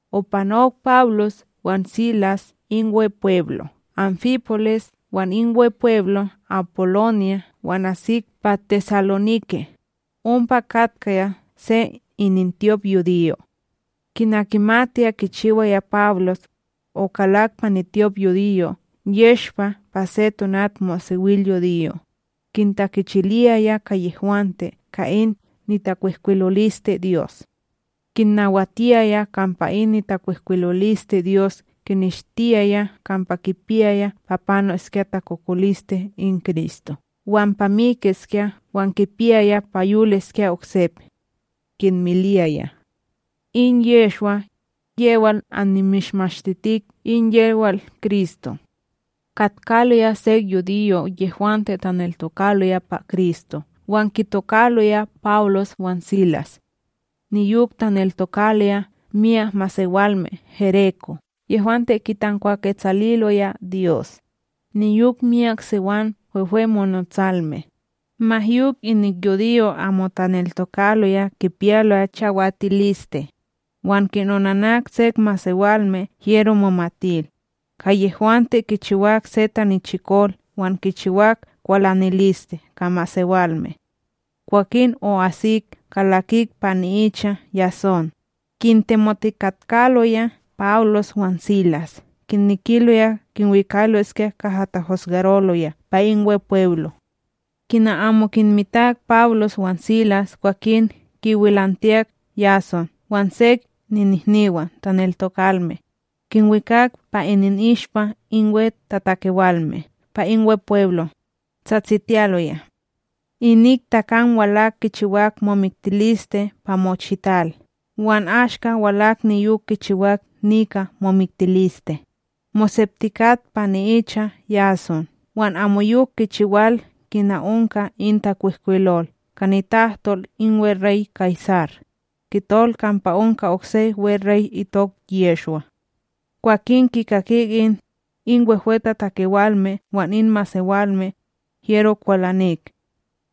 Opanok Pawlos wan Silas in Wepweblo' ÁnfiPolis wan in Wepweblo Apolónya wan asik pa TesaloNike, ompa katkaya se inintyopYudiyo'. Kina kimatiya kichiwaya Pawlos, okalak pa nityopYudiyo yeshpa pa se tonatmosewilyudiyo, kintakechiliyaya ka yehwante ka in nitakwihkwilolisteDyos. Kinnawatiyaya kampa in nitakwihkwilolisteDyos kineshtiyaya kampa kipiyaya pa panoskya takokoliste in Kristo wan pa mikiskya wan kipiyaya pa yoliskya oksep. Kinmiliyaya: —In Yehshwa, yewal annimishmashtitik in yewal Kristo. Katkaloya sek yudiyo' yehwante taneltokaloya pa Kristo wan kitokaloya Pawlos wan Silas. Niyok taneltokaloya miyak masewalme gereko' yehwante kitankwaketsaliloya Dyos, niyok myak siwam wehwemonotsalme. Ma yok inik yudiyo' amo taneltokaloya kipiyaloya chawatiliste, wan kinonanak sek masewalme hyero momatil, ka yehwante kichiwak se tanichikol wan kichiwak kwalaniliste ka masewalme. Kwakin o'asik kalakik pa ni'icha Yasón, kintemotikatkaloya Pawlos wan Silas kinekiloya kinwikaloskya kaha tahosgaroloya pa in Wepweblo. Kina amo kinmitak Pawlos wan Silas kwakin kiwilantiyak Yasón wan sek ninihniwan taneltokalme, kinwikak pa ininishpa in wehwetatakewalme pa in Wepweblo, tsatsitiyaloya: —Inik takam walak kichiwak momiktiliste pa mochital wan ashka walak niyok kichiwak nika momiktiliste, moseptikat pa ni'icha Yasón wan amoyok kichiwal kina onka in takwihkwilol ka nitahtol in weRey Kaysar, kitol kampa onka okse weRey itok Yehshwa. Kwah kikakik in, in wehwetatakewalme wan in masewalme, hyero kwalanik.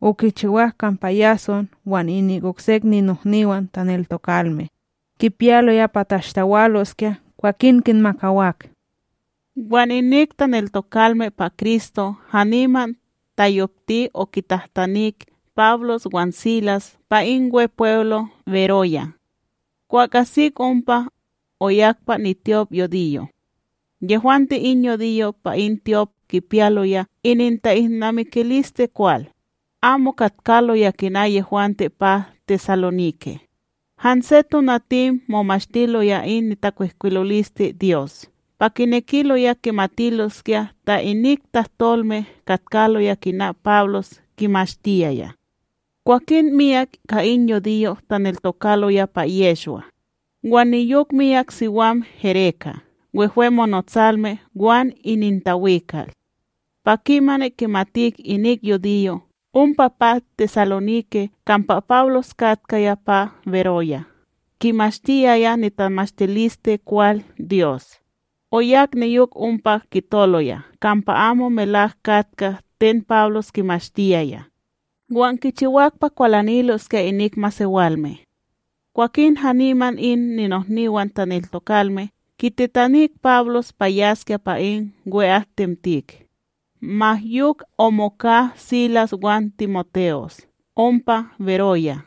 Okichiwak kampa Yasón wan inik oksek ninohniwan taneltokalme, kipiyaloya pa tashtawaloskya kwakin kinmakawak. Wan inik taneltokalme pa Kristo haniman tayopti okintitanik Pawlos wan Silas pa in Wepweblo Beroya. Kwah asik ompa, oyak pa nityopYudiyo. Yehwante in yudiyo' pa in tyop kipiyaloya ininta'ilnamikiliste kwal, amo katkaloya kina yehwante pa TesaloNike, hanse tonatim momashtiloya in nitakwihkwilolisteDyos pa kinekiloya kimatiloskya ta inik tahtolme katkaloya kina Pawlos kimashtiyaya. Kwakin myak ka in yudiyo' taneltokaloya pa Yehshwa, wan niyok miyak siwam gereka' wehwe monotsalme wan inintawikal. Pa kimani kimatik inik yudiyo' ompa pa TesaloNike kampa Pawlos katkaya pa Beroya kimashtiyaya nitamashtilisteKwal Dyos, oyak niyok ompa kitoloya kampa amo melawak katka ten Pawlos kimashtiyaya, wan kichiwak pa kwalaniloskya inik masewalme. Kwakin haniman in ninohniwan taneltokalme kititanik Pawlos pa yaskya pa in wehwe'atim, ma yok omoka Silas wan TimoTe'os ompa Beroya.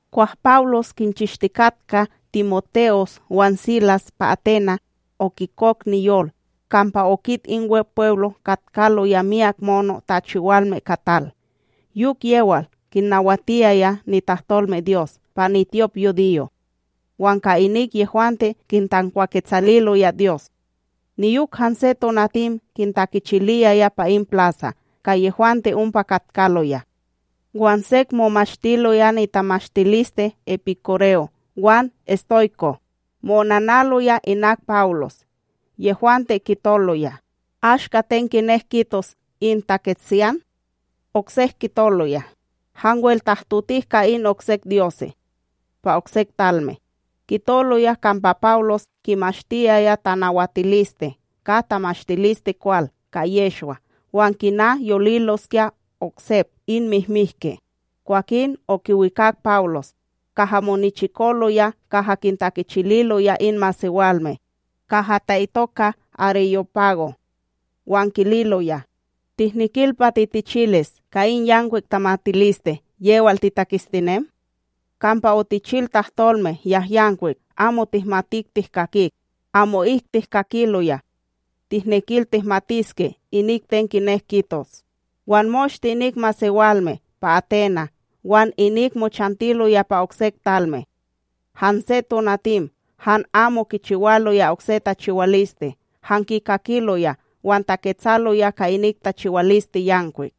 Kwah Pawlos kinchishtikatka TimoTe'os wan Silas pa Aténa', okikok niyol kampa okit in Wepweblo katkaloya miyak mono' tachiwalme ka tal. Yok, yewal kinnawatiyaya nitahtolmeDyos pa nityopYudiyo, wan ka inik yehwante kitankwaketsaliloya Dyos, niyok hanse tonatim kintakichiliyaya pa in plasa ka yehwante ompa katkaloya. Wan sek momashtiloya nitamatiliste epikúreo wan estoyko', mo'onanaloya inak Pawlos. Yehwante kitoloya: —Ashka ten kinek kitos in taketsiyan? Oksek kitoloya: —Hanwel tahtotik ka in oksek dyose' pa oksek talme. Kitoloya kampa Pawlos kimashtiyaya tanawatiliste ka tamashtilisteKwal ka Yehshwa wan kina yoliloskya oksep in mihmihki. Kwakin okiwikak Pawlos, kaha monichikoloya kaha kintakichililoya in masewalme, kaha ta'itoka AreyóPago, wan kililoya: —Tihnekil pa titichilis ka in yankwik tamatiliste yewal titaketstinem? Kampa otichil tahtolme yahyankwik amo tihmatik tihkakit, amo'ik tihkakiloya, tihnekil tihmatiske inik ten kinek kitos. Wan moshte inik masewalme pa Aténa', wan inik mochantiloya pa oksek talme, hanse tonatim han amo kichiwaloya okse tachiwaliste han kikakiloya wan taketsaloya ka inik tachiwaliste yankwik.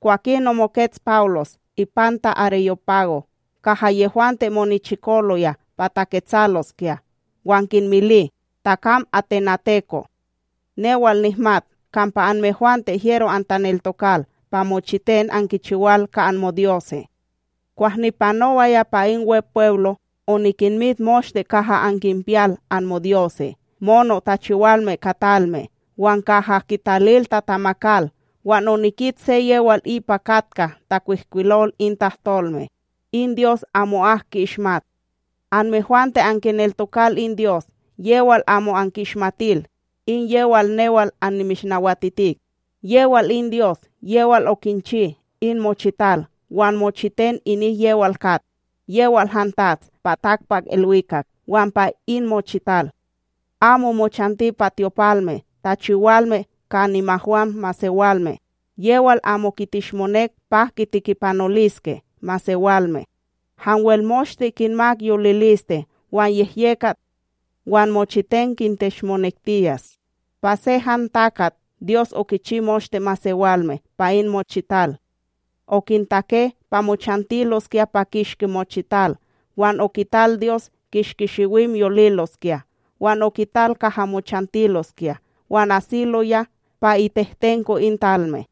Kwakin omokets Pawlos ipanta AreyóPago kaha yehwante monichikoloya pa taketsaloskya wan kinmili: —Takam atenateko', newal nihmat kampa anmehwante hyero antaneltokal pa mochiten ankichiwal ka anmodyose'. Kwah nipanowaya pa in Wepweblo, onikinmit moshte kaha ankinpiyal anmodyose' mono tachiwalme ka talme wan kaha kitalil tatamakal wan onikit se yewal ipa katka takwihkwilol in tahtolme: “In Dyos amo'ak ki'ishmat”. Anmehwante ankineltokal in Dyos yewal amo anki'ishmatil in yewal newal annimishnawatitik. ’Yewal in Dyos yewal okinchi in mochital wan mochiten inik yewal kat. Yewal han TATS pa takpakIlwikak wan pa in mochital, amo mochanti pa tyopalme tachiwalme ka nimahwam masewalme, yewal amo kitishmonek pa kitekipanoliske masewalme, hanwel moshte kinmak yoliliste, wan yehyekat wan mochiten kinteshmonektiyas. ’Pa se han takat Dyos okichi moshte masewalme pa in mochital, okintake pa mochantiloskya pa kishki mochital wan okital Dyos kishki shiwim yoliloskya wan okital kaha mochantiloskya wan asiloya pa itehtenko in talme,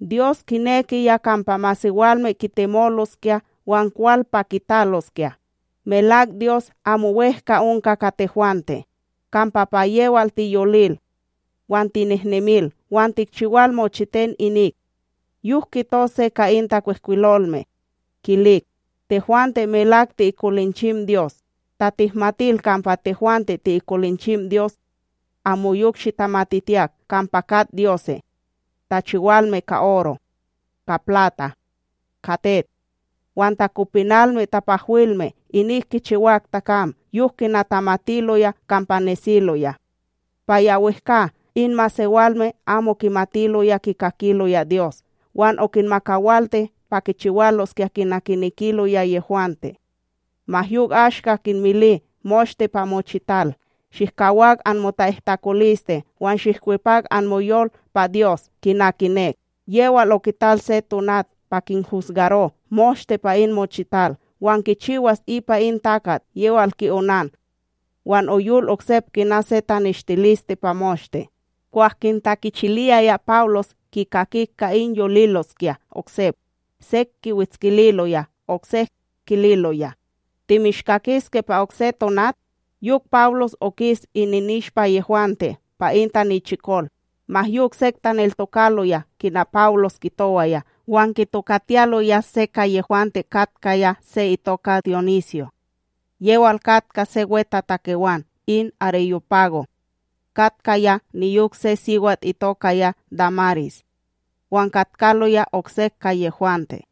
Dyos kinekiya kampa masewalme kitemoloskya wan kwal pa kitaloskya, melak Dyos amo wEhka onka ka tehwante. Kampa pa yewal tiyolil, wan tinehnemil wan tikchiwal mochiten inik; yok kito se ka in takwihkwilolme kilik: “Tehwante melak ti'ikolinchim Dyos.” Ta tihmatil kampa tehwante ti'ikolinchim Dyos, amoyok shitamatitiyak kampa kat dyose' tachiwalme ka oro, ka plata ka tet, wan takopinalme tapahwilme inik kichiwak takam yok kina tamatiloya kampa nesiloya, Pa ya wehkA in masewalme amo kimatiloya kikakiloya Dyos wan okinmakawalti pa kichiwaloskya kina kinekiloya yehwante, ma yok ashka kinmili moshte pa mochital shihkawak anmota'ihtakoliste wan shihkwepak anmoyol pa Dyos kina kinek. Yewal okital se tonat pa kinhusgaro moshte pa in mochital, wan kichiwas ipa in takat yewal ki'onan; wan oyol oksep kina se taneshtiliste pa moshte. Kwah kintakichiliyaya Pawlos kikakik ka in yoliloskya oksep, sek kiwetskililoya oksek kililoya: —Timishkakiske pa okse tonat. Yok Pawlos okis ininishpa yehwante pa in tanichikol. Ma yok sek taneltokaloya kina Pawlos kitowaya wan kitokatiyaloya se ka yehwante katkaya se itokaya Dionisyo, yewal katka se wetatakewan in AreyóPago, katkaya niyok se siwat itokaya Dámaris, wan katkaloya oksek ka yehwante.